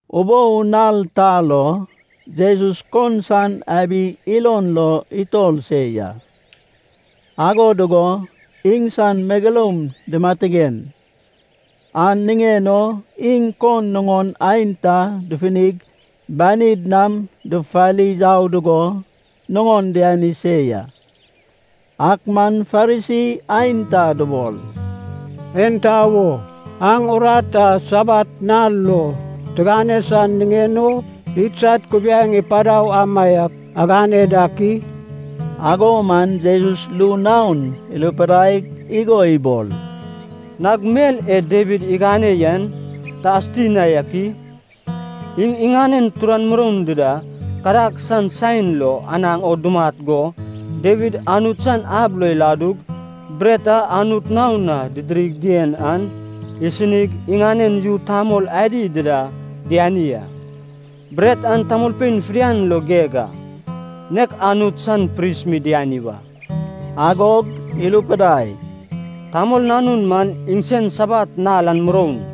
Ubou nal ta lo Jesus kon san abi ilon lo itor se ya. Ago dugo iŋsan megeloum dimatigen, an niŋen o iŋ kon nuŋon aenta dufunig banid nam dufufari yau dugo nuŋon diani se ya. Ak man Farisi aenta dubol, “Enta wo aŋ urat a Sabat nal lo tigane san niŋen o idsad kubiaeŋ ipadau amaiak agane dak i?” Ago man Jesus ru naon irupidaig igo ibol, “Nag mel e Dawid igane yen ta asuti na ak i? Iŋ iŋanen turan muroun dida kadag san saen lo anaŋ o dumat go, Dawid Anut san ab lo iladug, bret a Anut naon na didirig dien an isinig, iŋanen yu tamol adi dida diani a. Bret an tamolpein fidian lo geg a, nek Anut san pris mi diani wa.” Agog irupidai, “Tamol Nanun man iŋsen Sabat nal an muroun.”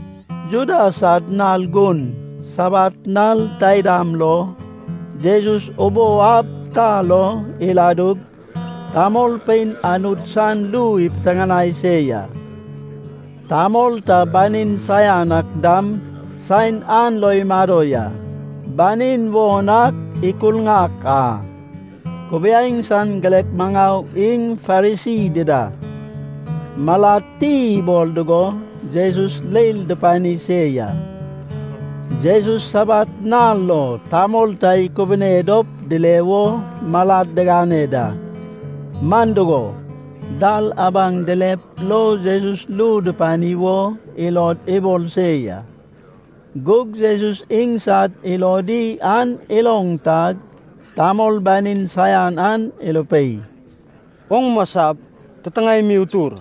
Juda sad nal gun Sabat nal taidam lo Jesus ubou ab ta lo iladug, tamolpein Anut san ru ipiteŋanai se ya. Tamol ta banin saian ak dam saen an lo imado ya. Banin won ak ikurŋak a. Kubiaeŋ san girek maŋau iŋ Farisi dida malad ti ibol dugo, Jesus leil dupani se ya. Jesus Sabat nal lo tamol ta ikubune dop dile wo malad digane da, man dugo, dal abaŋ dilep lo Jesus ru dupani wo ilod ibol se ya. Gug Jesus iŋsad ilodi an iloŋ tag, tamol banin saian an irupei, “Oŋ masap, titiŋae mi utur.”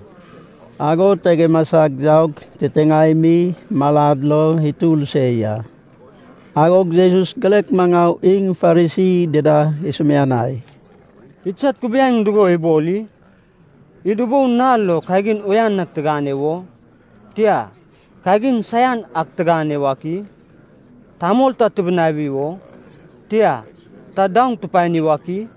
Ago tag imasag yaug titiŋae mi malad lo itur se ya. Agog Jesus girek maŋau iŋ Farisi dida isumianai, “Idsad kubiaeŋ dugo ibol i? Id ubou nal lo kagin uyan ak tigane wo? Tia, kagin saian ak tigane wak i? Tamol ta tibinawi wo? Tia, ta daoŋ tupani wak i?”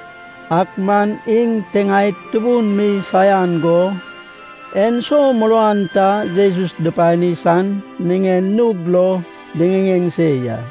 Ak man iŋ tiŋaed tubun mi saian go, enso muruan ta Jesus dupani san niŋen nug lo diŋiŋeŋ se ya.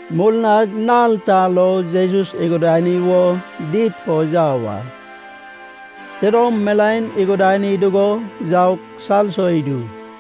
Murnag nal ta lo Jesus igudani wo did fo yau a. Tidom milaen igudani dugo yaug salso idu.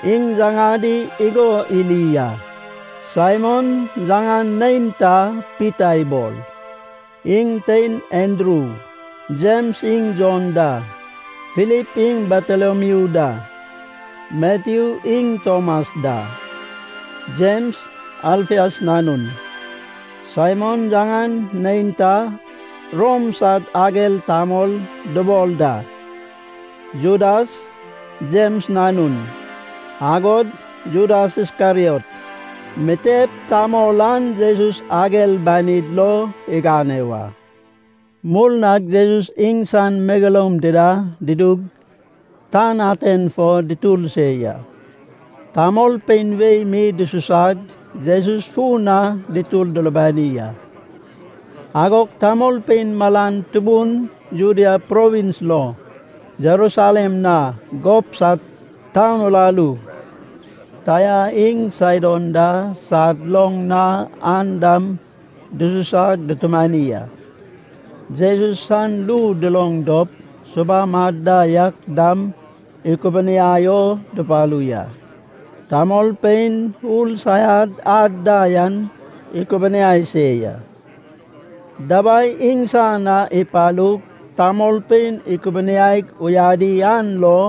Iŋ yaŋadi igo iri a: Saimon yaŋan neinta Pita ibol, iŋ tein Andru, Jems iŋ Jon da, Filip iŋ Batolomiu da, Matyu iŋ Tomas da, Jems, Alfias nanun, Saimon, yaŋan neinta “Rom sad ager tamol” dubol da, Judas, Jems nanun, agod Judas Iskeriot. Mitep tamol an Jesus ager banid lo igane wa. Murnag Jesus iŋsan megeloum dida dudug, tan aten fo dutur se ya. Tamolpein wei mi dususag Jesus fun na dutur dulubani a. Agog tamolpein malan tubun, Judea provins lo, Jerusalem na, gob sad taun uraru Taia iŋ Saidon da sad loŋ na yan dam dususag dutumani a. Jesus san ru duloŋ dop, subam ad da yak dam ikubuniai o dupalu ya. Tamolpein ur saian ad da yan ikubuniai se ya. Dabai iŋsan na ipalug tamolpein ikubuniaig uyadi an lo,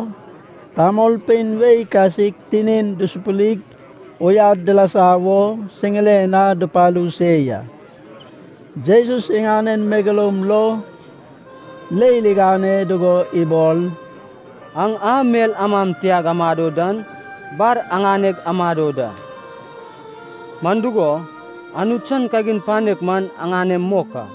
tamolpein wei kasik tinin dusupurip uyad dilasa wo siŋiren na dupalu se ya. Jesus iŋanen megeloum lo leil igane dugo ibol, “Aŋ a mel amam tiag amado dan, bar aŋaneg amado da. Man dugo, Anut san kagin panek man aŋanem mok a.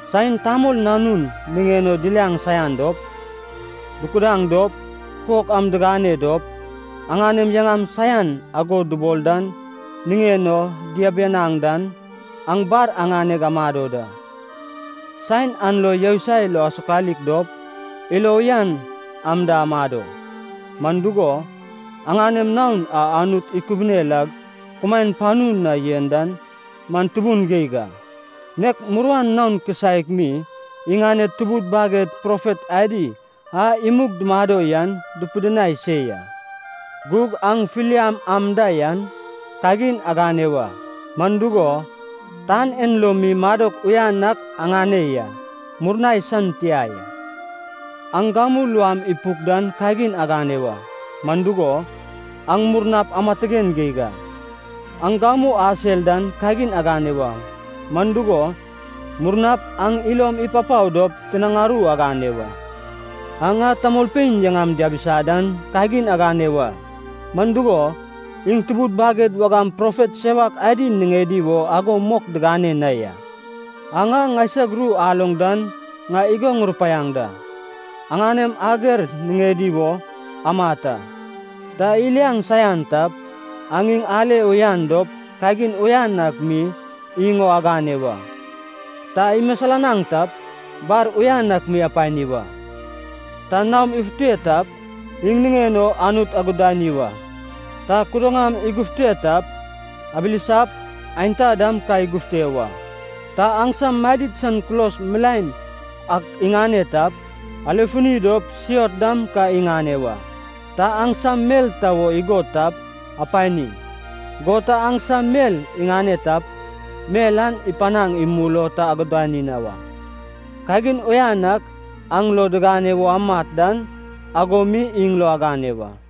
Saen Tamol Nanun niŋen o diliaŋ saian dop, dukudaŋ dop, kukok am digane dop, aŋanem yaŋam saian ago dubol dan niŋen o diabianaŋ dan, aŋ bar aŋaneg amado da.” “Saen an lo yousai lo asokalik dop ilo uyan am da amado, man dugo, aŋanem naon a Anut ikubune lag kumaen panu na yen dan man tubun geig a. Nek muruan naon kisaek mi iŋaned tubud baged profet adi a imug dumado yan dupidinai se ya.” “Gug aŋ filiam am da yan kagin agane wa. Man dugo, tan en lo mi madok uyan ak aŋane ya, murnai san tia ya. Aŋ gamu luam ipuk dan kagin agane wa. Man dugo, aŋ murnap amatigen geig a. Aŋ gamu asel dan kagin agane wa. Man dugo, murnap aŋ ilom ipapao dop tinaŋ aru agane wa. Aŋ a tamolpein yaŋam diabisa dan kagin agane wa. Man dugo, iŋ tubud baged wagam profet sewak adi niŋedi wo ago mok digane na ya.” “Aŋ a ŋaisag ru aloŋ dan ŋai igo ŋurupaiaŋ da. Aŋanem ager niŋedi wo amat a. Ta iliaŋ saian tap, aŋ iŋ ale uyan dop kagin uyan ak mi iŋ o agane wa. Ta imisilanaŋ tap, bar uyan ak mi apani wa. Ta naom ifute tap, iŋ niŋen o Anut agudani wa. Ta kudaŋam igufute tap, abilisap aenta dam ka igufute wa. Ta aŋsam madid san kulos milaen ak iŋane tap, alefuni dop siot dam ka iŋane wa. Ta aŋsam mel ta wo igod tap, apani. Go ta aŋsam mel iŋane tap, mel an ipanaŋ imul o ta agudani na wa. Kagin uyan ak aŋ lo digane wo amat dan, ago mi iŋ lo agane wa.”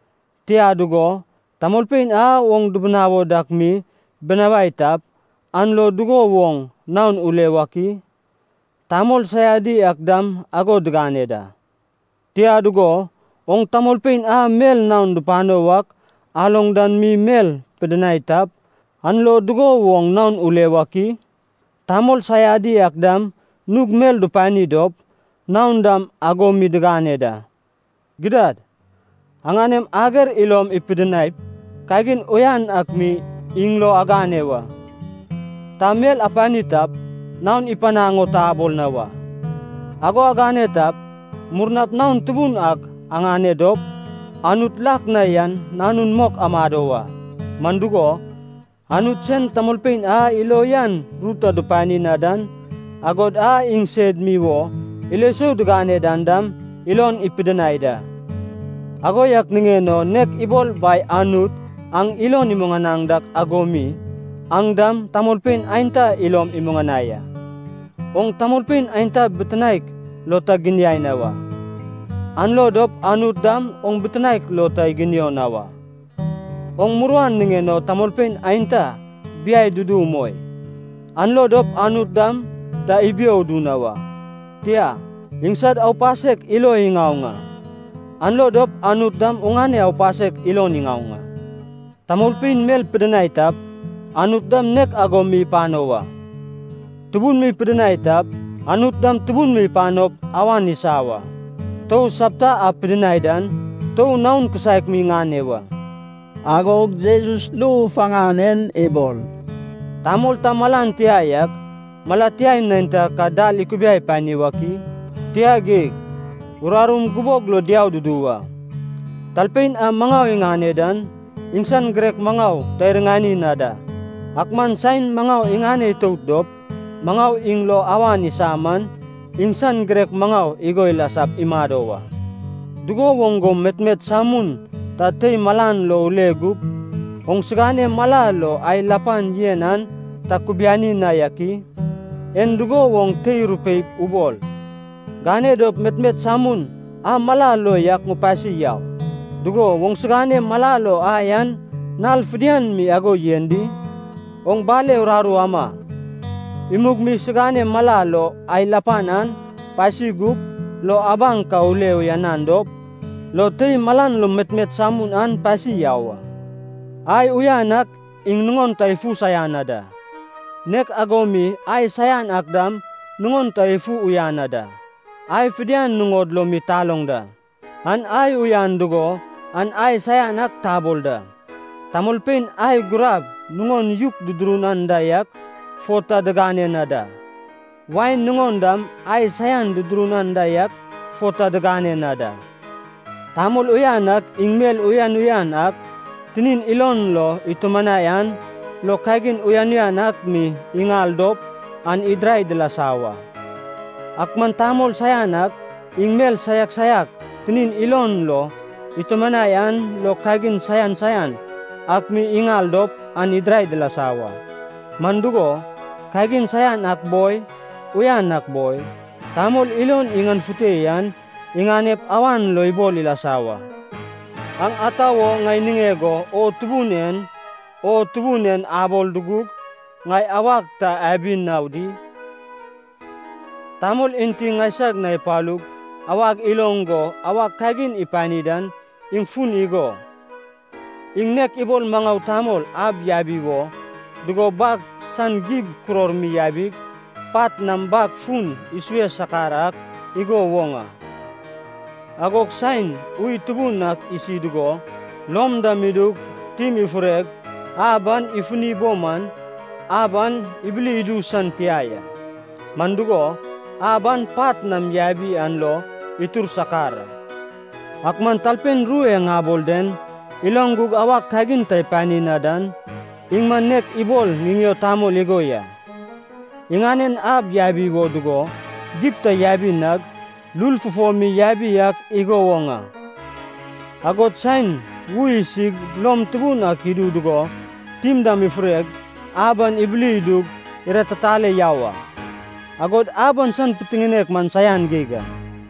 Tia dugo, tamolpein a oŋ dibinawo dak mi binawai tap, an lo dugo woŋ naon ule wak i? Tamol saiadi ak dam ago digane da. Tia dugo, oŋ tamolpein a mel naon dupano wak aloŋ dan mi mel pidinai tap, an lo dugo woŋ naon ule wak i? Tamol saiadi ak dam nug mel dupani dop, naon dam ago mi diŋane da. Gidad. Aŋanem ager ilom ipidinaip, kagin uyan ak mi iŋ lo agane wa. Ta mel apani tap, naon ipanaŋ o ta abol na wa. Ago agane tap, murnap naon tubun ak aŋane dop, Anut lak na yan nanun mok amado wa. Man dugo, Anut sen tamolpein a ilo uyan ru ta dupani na dan, agod a iŋsed mi wo ilo sou digane dan dam, ilon ipidinai da. Ago yak niŋen o nek ibol Bai Anut aŋ ilon imuŋanaŋ dak ago mi, aŋ dam tamolpein aenta ilom imuŋanai a.” “Oŋ tamolpein aenta bitinaek lo ta giniai na wa, an lo dop Anut dam oŋ bitinaek lo ta iginio na wa. Oŋ muruan niŋen o tamolpein aenta biai dudu umoi, an lo dop Anut dam ta ibio udu na wa. Tia, iŋsad aupasek ilo iŋaoŋ a, an lo dop Anut dam oŋane aupasek ilon iŋaoŋ a. Tamolpein mel pidinai tap, Anut dam nek ago mi ipano wa. Tubun mi pidinai tap, Anut dam tubun mi ipanop, awan isa wa. Tou sapta a pidinai dan, tou naon kisaek mi ŋane wa.” Agog Jesus ru faŋan en ibol, “Tamol ta malan tia yak, mala tia neinta ka dal ikubiai pani wak i? Tia geig. Urarum gubog lo diau dudu wa. Talpein a maŋau iŋane dan, iŋsan girek maŋau ta iriŋani na da. Ak man saen maŋau iŋane itout dop maŋau iŋ lo awan isa man, iŋsan girek maŋau igo ilasap imado wa.” “Dugo woŋ go metmet samun ta tei malan lo ule gug oŋsigane mala lo ai lapan yen an ta kubiani na yak i? En dugo woŋ tei rupeip ubol, ‘Gane dop metmet samun an mala lo yak ŋupasi yau,’ dugo oŋsigane mala lo ai an nal fidian mi ago yen di? Oŋ bale uraru ama, imug mi sigane mala lo ai lapan an pasi gup, lo abaŋ ka ule uyanan dop, lo tei malan lo metmet samun an pasi yau a.” “Ai uyan ak iŋ nuŋon ta ifu saian na da. Nek ago mi ai saian ak dam nuŋon ta ifu uyan na da. Ai fidian nuŋod lo mi taloŋ da. An ai uyan dugo an ai saian ak tabol da. Tamolpein ai gurab nuŋon yuk dudurun anda yak fo ta diŋane na da. Wain nuŋon dam ai saian dudurun anda yak fo ta diŋane na da. Tamol uyan ak iŋ mel uyan uyan ak tinin ilon lo itumanai an lo kagin uyan uyan ak mi iŋal dop an idirai dilasa wa. Ak man tamol saian ak iŋ mel saiak saiak tinin ilon lo itumanai an lo kagin saian saian ak mi iŋal dop an idirai dilasa wa. Man dugo, kagin saian ak boi, uyan ak boi, tamol ilon iŋanefute yan iŋanep awan lo ibol ilasa wa.” “Aŋ ata wo ŋai niŋeg o ‘O Tubun en, O Tubun en’ abol dugug ŋai awag ta abi na di? Tamol enti ŋaisag na ipalug awag iloŋ go awag kagin ipani dan iŋ fun igo: iŋ nek ibol maŋau tamol ab yabi wo dugo bag san gib kuror mi yabig, pat nam bag fun isue sakar ak igo woŋ a. Agog saen ui tubun ak isi dugo, lom dam idug tim ifureg ab an ifuni bo man, ab an ibili idu san tia ya. Man dugo, ab an pat nam yabi an lo itur sakar a. Ak man talpein ru e ŋabol den iloŋ gug awag kagin ta ipani na dan, iŋ man nek ibol ŋiŋeo tamol igo ya, iŋanen ab yabi wo dugo gib ta yabi nag, lul fufo mi yabi ak igo woŋ a. Agod saen ui isig lom tubun ak idu dugo tim dam ifureg, ab an ibili idug iratitale yau a. Agod ab an san pitiŋinek man saian geig a.”